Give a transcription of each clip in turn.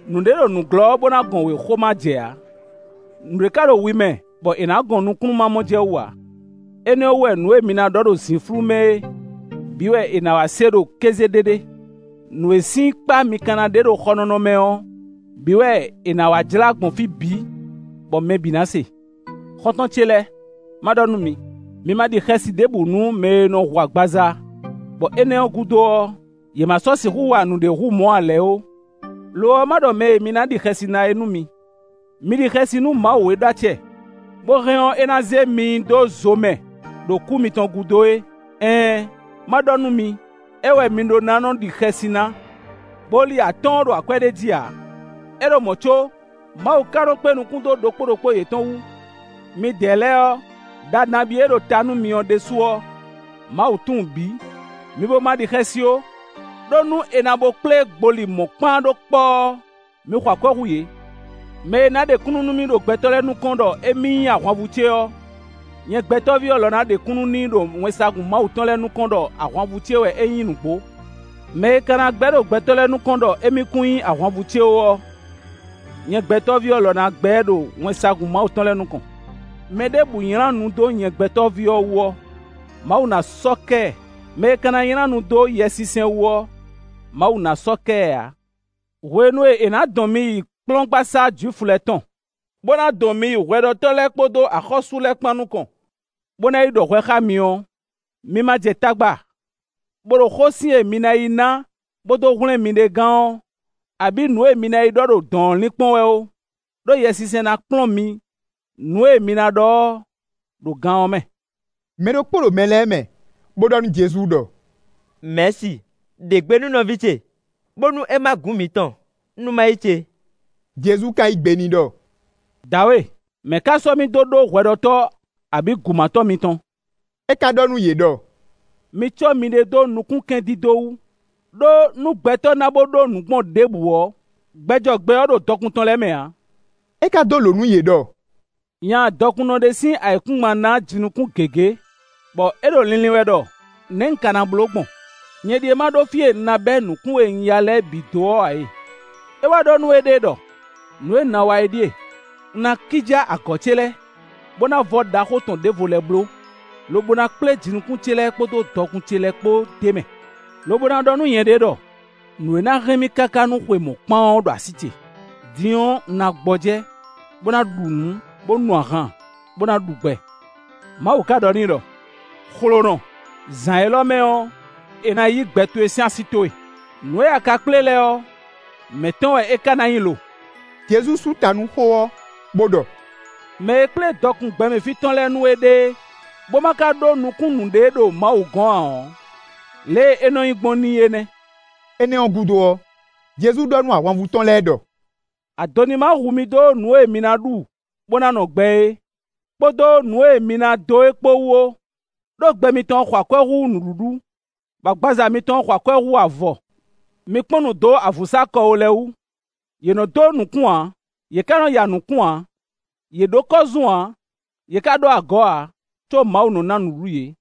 Nǔɖé ɖo nǔglɔ́, bó ná gɔn wěxo ma jɛ ǎ; nǔɖé ka ɖo wi mɛ bɔ è nǎ gɔn nukúnnú ma mɔ jɛ wú ǎ. Énɛ́ ɔ́ wú wɛ nǔ e mi ná ɖɔ ɖo zǐnflú mɛ é bǐ wɛ è nǎ wá se ɖo kéze ɖéɖé. Nǔ e sín kpá mi ka ná ɖe ɖo xɔnɔnɔ mɛ ɔ́, bǐ wɛ è nǎ wá jlá gbɔn fí bǐ, bɔ mɛ bǐ ná se.” “Xɔ́ntɔn ce lɛ́ɛ, má ɖɔ nú mi; mi ma ɖi xɛsi ɖěbǔ nú mɛ e nɔ hu agbaza, bɔ énɛ́ ɔ́ gúdo ɔ́, yě ma sɔ́ sixú wa nǔɖé hú mɔ̌ ǎ lɛ́ɛ ó. Lo ɔ́, ma ɖɔ mɛ e mi ná ɖi xɛsi ná é nú mi: mi ɖi xɛsi nú Mawu e ɖó acɛ, bó hɛn ɔ́, é ná zé mi nyi dó zo mɛ ɖo kú mitɔn gúdo é. Ɛɛn! Má ɖɔ nú mi: é wɛ mi ɖó ná nɔ ɖi xɛsi ná. “Gboli atɔ́ɔ́n ɖo akwɛ́ ɖé jí ǎ; é ɖo mɔ̌ có, Mawu ka nɔ kpé nukún dó ɖokpó ɖokpó yětɔn wu. Midɛɛ lɛ́ɛ ɔ́, ɖa nabí e ɖo ta nú mi ɔ́ ɖésú ɔ́, Mawu tunwun bǐ; mi bó ma ɖi xɛsi ó. Đó nú è na bo kplé gboli mɔ̌kpán ɖó kpɔ́ ɔ́, mi xɔ akwɛ́ hú yě.” “Mɛ e ná ɖe kúnnu nú mì ɖo gbɛtɔ́ lɛ́ɛ nukɔn ɖɔ émí nyí ahwanvú ce ɔ́, nyɛ Gbɛtɔ́ví ɔ́ lɔ ná ɖe kúnnu n'i ɖo wɛnsagun Mawu tɔn lɛ́ɛ nukɔn ɖɔ ahwanvú ce wɛ é nyí nǔgbó. Mɛ e ka na gbɛ́ ɖo gbɛtɔ́ lɛ́ɛ nukɔn ɖɔ émí kún nyí ahwanvú ce ó ɔ́, nyɛ Gbɛtɔ́ví ɔ́ lɔ na gbɛ́ ɛ ɖo wɛnsagun Mawu tɔn lɛ́ɛ nukɔn. “Mɛɖěbǔ nylá nu dó nyɛ Gbɛtɔ́ví ɔ́ wú ɔ́, Mawu ná sɔ́ kɛ ɛ. Mɛ e ka ná nylá nu dó Yɛsinsɛn wú ɔ́, Mawu ná sɔ́ kɛ ɛ ǎ. “Hwenu e è nǎ dɔn mi yi kplɔ́ngbasá Jwifu lɛ́ɛ tɔn, bó ná dɔn mi yi hwɛɖɔtɔ́ lɛ́ɛ kpódó axɔ́sú lɛ́ɛ kpán nukɔn, bó ná yi ɖɔ hwɛ xá mi ɔ́, mi ma jɛ tagba, bó ɖo xósin e mi ná yi ná bó dó hwlɛ́n miɖée gán ɔ́, abǐ nǔ e mi ná yi ɖɔ ɖo dɔ̌n ɔ́ linkpɔ́n wɛ ó, ɖó Yɛsinsɛn ná kplɔ́n mi nǔ e mi ná ɖɔ ɔ́, ɖo gan ɔ́ mɛ.” Mɛ ɖokpó ɖo mɛ lɛ́ɛ mɛ, bó ɖɔ nú Jezu ɖɔ: “Mɛ̌si, ɖe gbe nú nɔví ce, bónú é má gǔ mǐtɔn, nú má yí ce.” Jezu ka yí gbe n'i ɖɔ: “Dǎwe! Mɛ̌ ká sɔ́ mì dó ɖó hwɛɖɔtɔ́, abǐ gǔmátɔ́ mitɔn?” É ka ɖɔ nú yě ɖɔ: “Mi cɔ́ miɖée dó nukúnkɛndídó wú; ɖó nú gbɛtɔ́ na bo ɖó nǔ gbɔn ɖěbǔ ɔ́, gbɛ jɔ gbɛ ɔ́ ɖo dɔkun tɔn lɛ́ɛ mɛ ǎ.” É ka dó lǒ nú yě ɖɔ: “Nya dɔkunnɔ ɖé sín ayǐkúngban ná jinukún gěgé, bɔ é ɖo linlin wɛ ɖɔ: ‘Nɛ̌ un ka ná bló gbɔn? Nyɛ ɖíe ma ɖó fí e un ná bɛ́ nǔkún e un ya lɛ́ɛ bǐ dó ɔ́ ǎ e!’ É wá ɖɔ nú éɖée ɖɔ: ‘Nǔ e un ná wa é ɖíe: un ná kíjá agɔ̌ ce lɛ́ɛ, bó ná vɔ́ ɖaxó tɔn ɖěvo lɛ́ɛ bló, lobo ná kplé jinukún ce lɛ́ɛ kpódó dɔkun ce lɛ́ɛ kpó d'é mɛ; lobo ná ɖɔ nú nyɛɖée ɖɔ: nǔ e ná hɛn mì káká nú xwe mɔ̌kpán ɔ́ ɖo así ce; din ɔ́, un ná gbɔjɛ́, bó ná ɖu nǔ, bó nu ahan, bó ná ɖu gbɛ.’ Mawu ka ɖɔ n'i ɖɔ: ‘Xlonɔ; zǎn élɔ́ mɛ ɔ́, è nǎ yǐ gbɛ towe sín así towe. Nǔ e a ka kplé lɛ́ɛ ɔ́, mɛ̌ tɔn wɛ é ka ná nyí lo?’” Jezu sú ta nú xó ɔ́, bó ɖɔ: “Mɛ e kplé dɔkun gbɛmɛ fí tɔn lɛ́ɛ nú éɖée, bó ma ka ɖó dɔkun ɖé ɖo Mawu gɔ̌n ǎ ɔ́, lě e é nɔ́ nyí gbɔn n'i é nɛ́.” Énɛ́ ɔ́ gúdo ɔ́, Jezu ɖɔ nú ahwanvú tɔn lɛ́ɛ ɖɔ: “Ado ní ma hu mi dó nǔ e mi ná ɖu bó ná nɔ gbɛ é kpódó nǔ e mi ná dó é kpó wú ó; ɖó gbɛ mitɔn xɔ akwɛ́ hú nǔɖuɖu, bɔ agbaza mitɔn xɔ akwɛ́ hú avɔ. Mi kpɔ́n nǔ dó avǔnsákɔwó lɛ́ɛ wú: yě nɔ́ dó nǔkún ǎ, yě ká nɔ́ ya nǔkún ǎ; yě ɖó kɔ́zún ǎ, yě ká ɖó agɔ̌ ǎ, có Mawu nɔ́ ná nǔɖuɖu yě;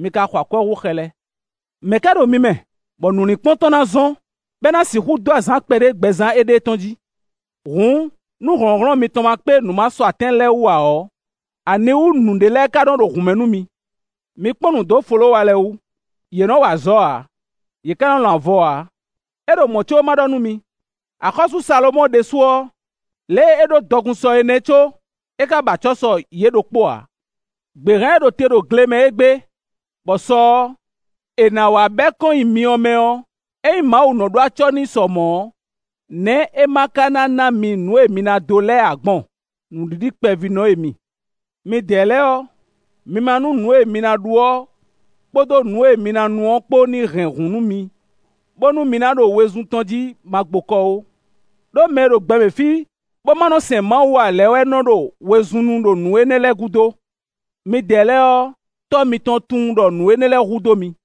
mi ka xɔ akwɛ́ hú xɛ lɛ́ɛ. Mɛ̌ ka ɖo mi mɛ, bɔ nǔlinkpɔ́n tɔn ná zɔ́n, bɔ é ná sixú dó azǎn kpɛɖé gbɛzán éɖée tɔn jí? Hǔn, nú hlɔ̌nhlɔ́n mitɔn ma kpé nǔ masɔatɛ́n lɛ́ɛ wú ǎ ɔ́, aniwú nǔɖé lɛ́ɛ ka nɔ́ ɖo hǔn mɛ nú mi? Mi kpɔ́n nǔ dó folówa lɛ́ɛ wú; yě nɔ́ wa azɔ̌ ǎ; yě ká nɔ́ lɔn avɔ ǎ, é ɖo mɔ̌ có, má ɖɔ nú mi: axɔ́sú Salomɔ́ɔ ɖésú ɔ́, lě e é ɖó dɔkun sɔ é nɛ́ có, é ká ba acɔ́ sɔ yě ɖokpó ǎ. Gběhan e ɖo te ɖo gle mɛ égbé bɔ sɔ ɔ́, è nǎ wá bɛ́ kɔn nyi myɔ mɛ ɔ́, ényí Mawu nɔ ɖó acɔ́ n'i sɔ mɔ̌ ɔ́, nɛ̌ é ma ka ná ná mi nǔ e mi ná dó lɛ́ɛ ǎ gbɔn? Nǔɖiɖikpɛvínɔ e mi. Midɛɛ lɛ́ɛ ɔ́, mi ma nú nǔ e mi ná ɖu ɔ́ kpódó nǔ e mi ná nu ɔ́ kpó ní hɛn hǔn nú mi, bónú mi ná ɖo wezun tɔn jí magbokɔ ó. Đó mɛ e ɖo gbɛmɛ fí, bó má nɔ sɛn Mawu ǎ lɛ́ɛ wɛ nɔ ɖo wezun nu ɖo nǔ énɛ́ lɛ́ɛ gúdo. Midɛɛ lɛ́ɛ ɔ́, Tɔ́ mitɔn tunwun ɖɔ nǔ énɛ́ lɛ́ɛ hu dó mi.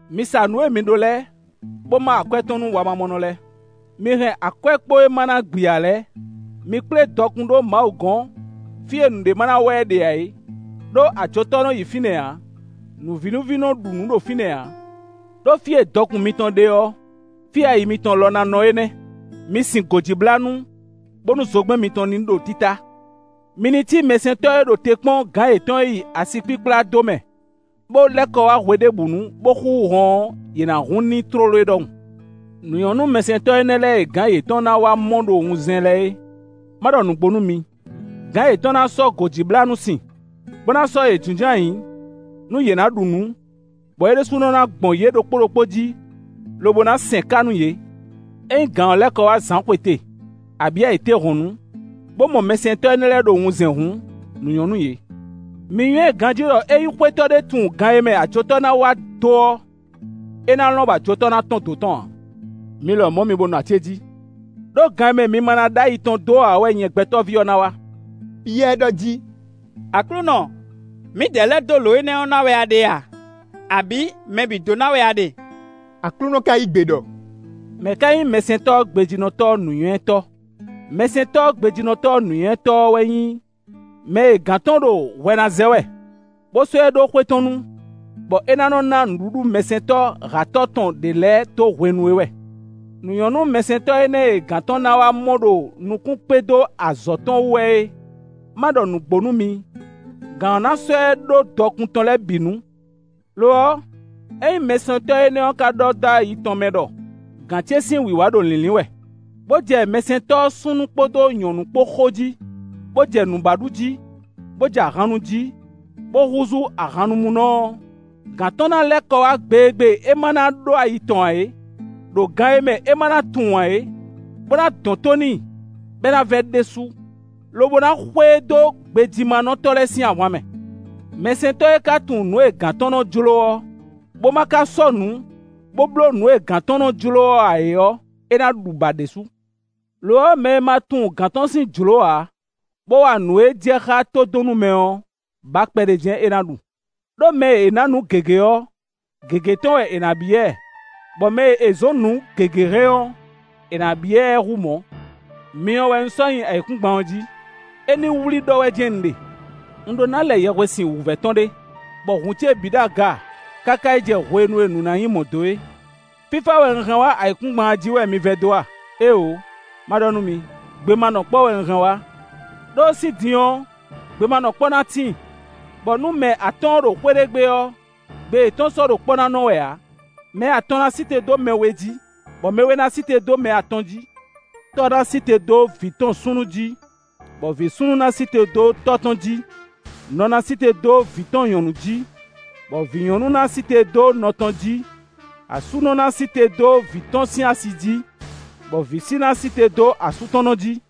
Mi sa nǔ e mi ɖó lɛ́ɛ, bó má akwɛ́ tɔn nú wamamɔnɔ lɛ́ɛ. Mi hɛn akwɛ́kpo e ma ná gbi ǎ lɛ́ɛ; mi kplé dɔkun ɖó Mawu gɔ́n fí e nǔɖé ma ná wa ɛ ɖe ǎ é; ɖó ajotɔ́ nɔ yi fínɛ́ ǎ; nǔvínúví nɔ ɖu nǔ ɖo fínɛ́ ǎ. Đó fí e dɔkun mitɔn ɖe ɔ́, fí e ayi mitɔn lɔ ná nɔ é nɛ́.” “Mi sin gǒjíblánú, bónú zogbɛ́n mitɔn ní ɖo títá. Mi ní cí mɛsɛntɔ́ e ɖo te kpɔ́n gǎn yětɔn e yi asikpíkplá do mɛ, bó lɛ́ kɔ wá hweɖěbǔnu, bó xúxú hɔn ɔ́, yě ná hun n'i tlóló é ɖɔhun. Nǔ nyɔ́ nú mɛsɛntɔ́ énɛ́ lɛ́ɛ e gǎn yětɔn ná wá mɔ ɖo wunzɛn lɛ́ɛ é. Má ɖɔ nǔgbó nú mi: gǎn yětɔn ná sɔ́ gǒjíblánú sin, bó ná sɔ́ yě jínjɔ́n ayǐ nú yě ná ɖu nǔ, bɔ é ɖésú ná gbɔn yě ɖokpó ɖokpó jí, lobo ná sɛn ká nú yě. Ényí gǎn ɔ́ lɛ́ kɔ wá zǎnxwete, abǐ ayǐtéhɔ̌nnu, bó mɔ mɛsɛntɔ́ énɛ́ lɛ́ɛ ɖo wunzɛn hǔn, nǔ nyɔ́ nú yě. “Mi nywɛ́ ganjí ɖɔ ényí xwétɔ́ ɖé tunwun gan e mɛ ajotɔ́ ná wá dó ɔ́, é ná lɔn bɔ ajotɔ́ ná tɔ́n dǒ tɔn ǎ. Mi lɔmɔ̌ mi bó nɔ acéjí, ɖó gan e mɛ mi ma ná ɖó ayi tɔn dó ǎ ɔ́ wɛ nyɛ Gbɛtɔ́ví ɔ́ ná wá.” Piyɛ́ɛ ɖɔ jí: “Aklúnɔ, mǐdɛɛ lɛ́ɛ dó lǒ énɛ́ ná wɛ a ɖe a, abǐ mɛ bǐ dó ná wɛ a ɖe?” Aklúnɔ ka yí gbe ɖɔ: “Mɛ̌ ká nyí mɛsɛntɔ́ gbejínɔtɔ́ nǔnywɛ́tɔ́? Mɛsɛntɔ́ gbejínɔtɔ́ nǔnywɛ́tɔ́ ɔ́ wɛ nyí mɛ e gǎn tɔn ɖo hwɛ ná zɛ wɛ, bó sɔ́ ɛ ɖó xwé tɔn nu, bɔ é ná nɔ́ ná nǔɖuɖu mɛsɛntɔ́ hǎtɔ́ tɔn ɖě lɛ́ɛ dó hwenu é wɛ. Nǔ nyɔ́ nú mɛsɛntɔ́ énɛ́ e gǎn tɔn ná wá mɔ ɖo nukún kpé dó azɔ̌ tɔn wú wɛ é. Má ɖɔ nǔgbó nú mi: gǎn ɔ́ ná sɔ́ ɛ ɖó dɔkun tɔn lɛ́ɛ bǐ nu. Lo ɔ́, ényí mɛsɛntɔ́ énɛ́ ɔ́ ka ɖɔ dó ayi tɔn mɛ ɖɔ: ‘Gǎn ce sín wǐwá ɖo lǐnlín wɛ’, bó jɛ mɛsɛntɔ́ súnnu kpódó nyɔ̌nu kpó xo jí, bó jɛ nǔ ba ɖu jí, bó jɛ ahan nu jí, bó húzú ahannumúnɔ ɔ́, gǎn tɔn ná lɛ́ kɔ wá gbe e gbe é ma ná ɖó ayi tɔn ǎ é, ɖo gan e mɛ é ma ná tunwun ǎ é, bó ná dɔn tó n'i, bɔ é ná vɛ́ ɖésú, lobo ná xwe e dó gbejímánɔtɔ́ lɛ́ɛ sín ahwan mɛ. “Mɛsɛntɔ́ e ka tunwun nǔ e gǎn tɔn nɔ jló ɔ́, bó ma ka sɔ́nǔ, bó bló nǔ e gǎn tɔn nɔ jló ɔ́ ǎ é ɔ́, é ná ɖu bǎ ɖésú.” Lo ɔ́, mɛ e ma tunwun gǎn tɔn sín jlǒ ǎ, bó wa nǔ e jɛ xá tó dɔn nú mɛ ɔ́, bǎ kpɛɖé jɛ́n é ná ɖu; ɖó mɛ e è nǎ nǔ gěgé ɔ́, gěgé tɔn wɛ è nǎ byɔ́ ɛ; bɔ mɛ e è zɔ̌n nǔ gěgé hɛn ɔ́, è nǎ byɔ́ ɛ hú mɔ̌. “Myɔ wɛ un sɔ́ nyí ayǐkúngban ɔ́ jí; é ní wlí ɖɔ wɛ jɛ́n un ɖe. Un ɖó ná lɛ yɛhwesin wǔvɛ́ tɔn ɖé, bɔ hǔn ce bǐ ɖo aga káká yi jɛ hwenu e nǔ ná nyí mɔ̌ dó é. Fífá wɛ un hɛn wá ayǐkúngban ɔ́ jí wɛ mi vɛdó a? Éeǒ! Ma ɖɔ nú mi: gbemanɔkpɔ́ wɛ un hɛn wá. Đó sín din ɔ́, gbemanɔkpɔ́ ná tíin, bɔ nú mɛ atɔ́ɔ́n ɖo xwé ɖé gbe ɔ́, gbe yětɔn sɔ́ ɖo kpɔ́ ná nɔ wɛ ǎ; mɛ atɔn ná sí te dó mɛ we jí, bɔ mɛ we ná sí te dó mɛ atɔn jí. Tɔ́ ná sí te dó vǐ tɔn súnnu jí, bɔ vǐ súnnu ná sí te dó tɔ́ tɔn jí; nɔ ná sí te dó vǐ tɔn nyɔ̌nu jí, bɔ vǐ nyɔ̌nu ná sí te dó nɔ tɔn jí; asúnɔ ná sí te dó vǐ tɔn sín asi jí; bɔ vǐsi ná sí te dó asú tɔn nɔ jí.”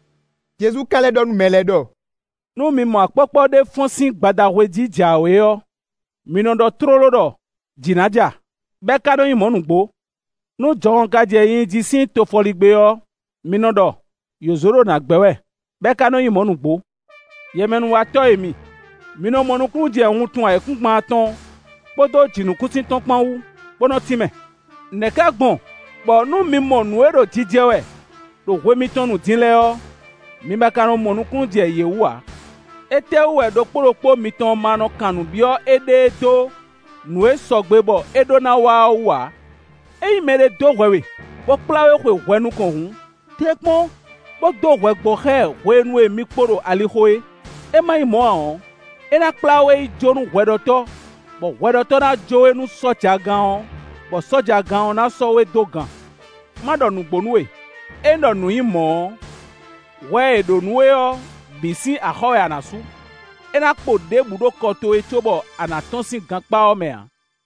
Jezu ka lɛ́ ɖɔ nú mɛ lɛ́ɛ ɖɔ: “Nú mi mɔ akpɔ́kpɔ́ ɖé fɔ́n sín gbadahwe jí jǎwe ɔ́, mi nɔ ɖɔ tlóló ɖɔ: ‘Jǐ ná ja’, bɔ é ká nɔ nyí mɔ̌ nǔgbó. Nú jɔhɔn ka jɛ nyinyi jí sín tofɔligbé ɔ́, mi nɔ ɖɔ: ‘Yǒzo ɖo nǎ gbɛ́ wɛ’, bɔ é ka nɔ nyí mɔ̌ nǔgbó. Yɛmɛnúwatɔ́ e mi, mi nɔ mɔ nukúnnú jɛ wuntun ayǐkúngban tɔn kpódó jǐnukúnsin tɔn kpán wú, bó nɔ́ tínmɛ. Nɛ̌ ká gbɔn bɔ nú mi mɔ nǔ e ɖo jijɛ wɛ ɖo hwe mitɔn nu din lɛ́ɛ ɔ́, mi ma ka nɔ mɔ nukúnnú jɛ yě wú ǎ?” “Étɛ́wú wɛ ɖokpó ɖokpó mitɔn ma nɔ kan nǔ byɔ́ éɖée dó nǔ e sɔgbe bɔ é ɖo ná wa ɔ́ wú ǎ? Ényí mɛɖé dó hwɛ we, bó kplá we xwe hwɛ nukɔn hǔn, tɛ́nkpɔ́n, bó dó hwɛ gbɔ xá ɛ hwenu e mi kpo ɖo alixo é; é má nyí mɔ̌ ǎ ɔ́, é ná kplá we yi jó nú hwɛɖɔtɔ́, bɔ hwɛɖɔtɔ́ ná jó we nú sɔ́jagán ɔ́, bɔ sɔ́jagán ɔ́ ná sɔ́ we dó gan. Má ɖɔ nǔgbó nú we: ényí ɖɔ nǔ nyǐ mɔ̌ ɔ́, hwɛ e è ɖǒ nú we ɔ́, bǐ sín axɔ́ wɛ a nǎ sú; é ná kpo ɖěbǔ ɖo kɔ towe cóbɔ a nǎ tɔ́n sín gankpá ɔ́ mɛ ǎ.”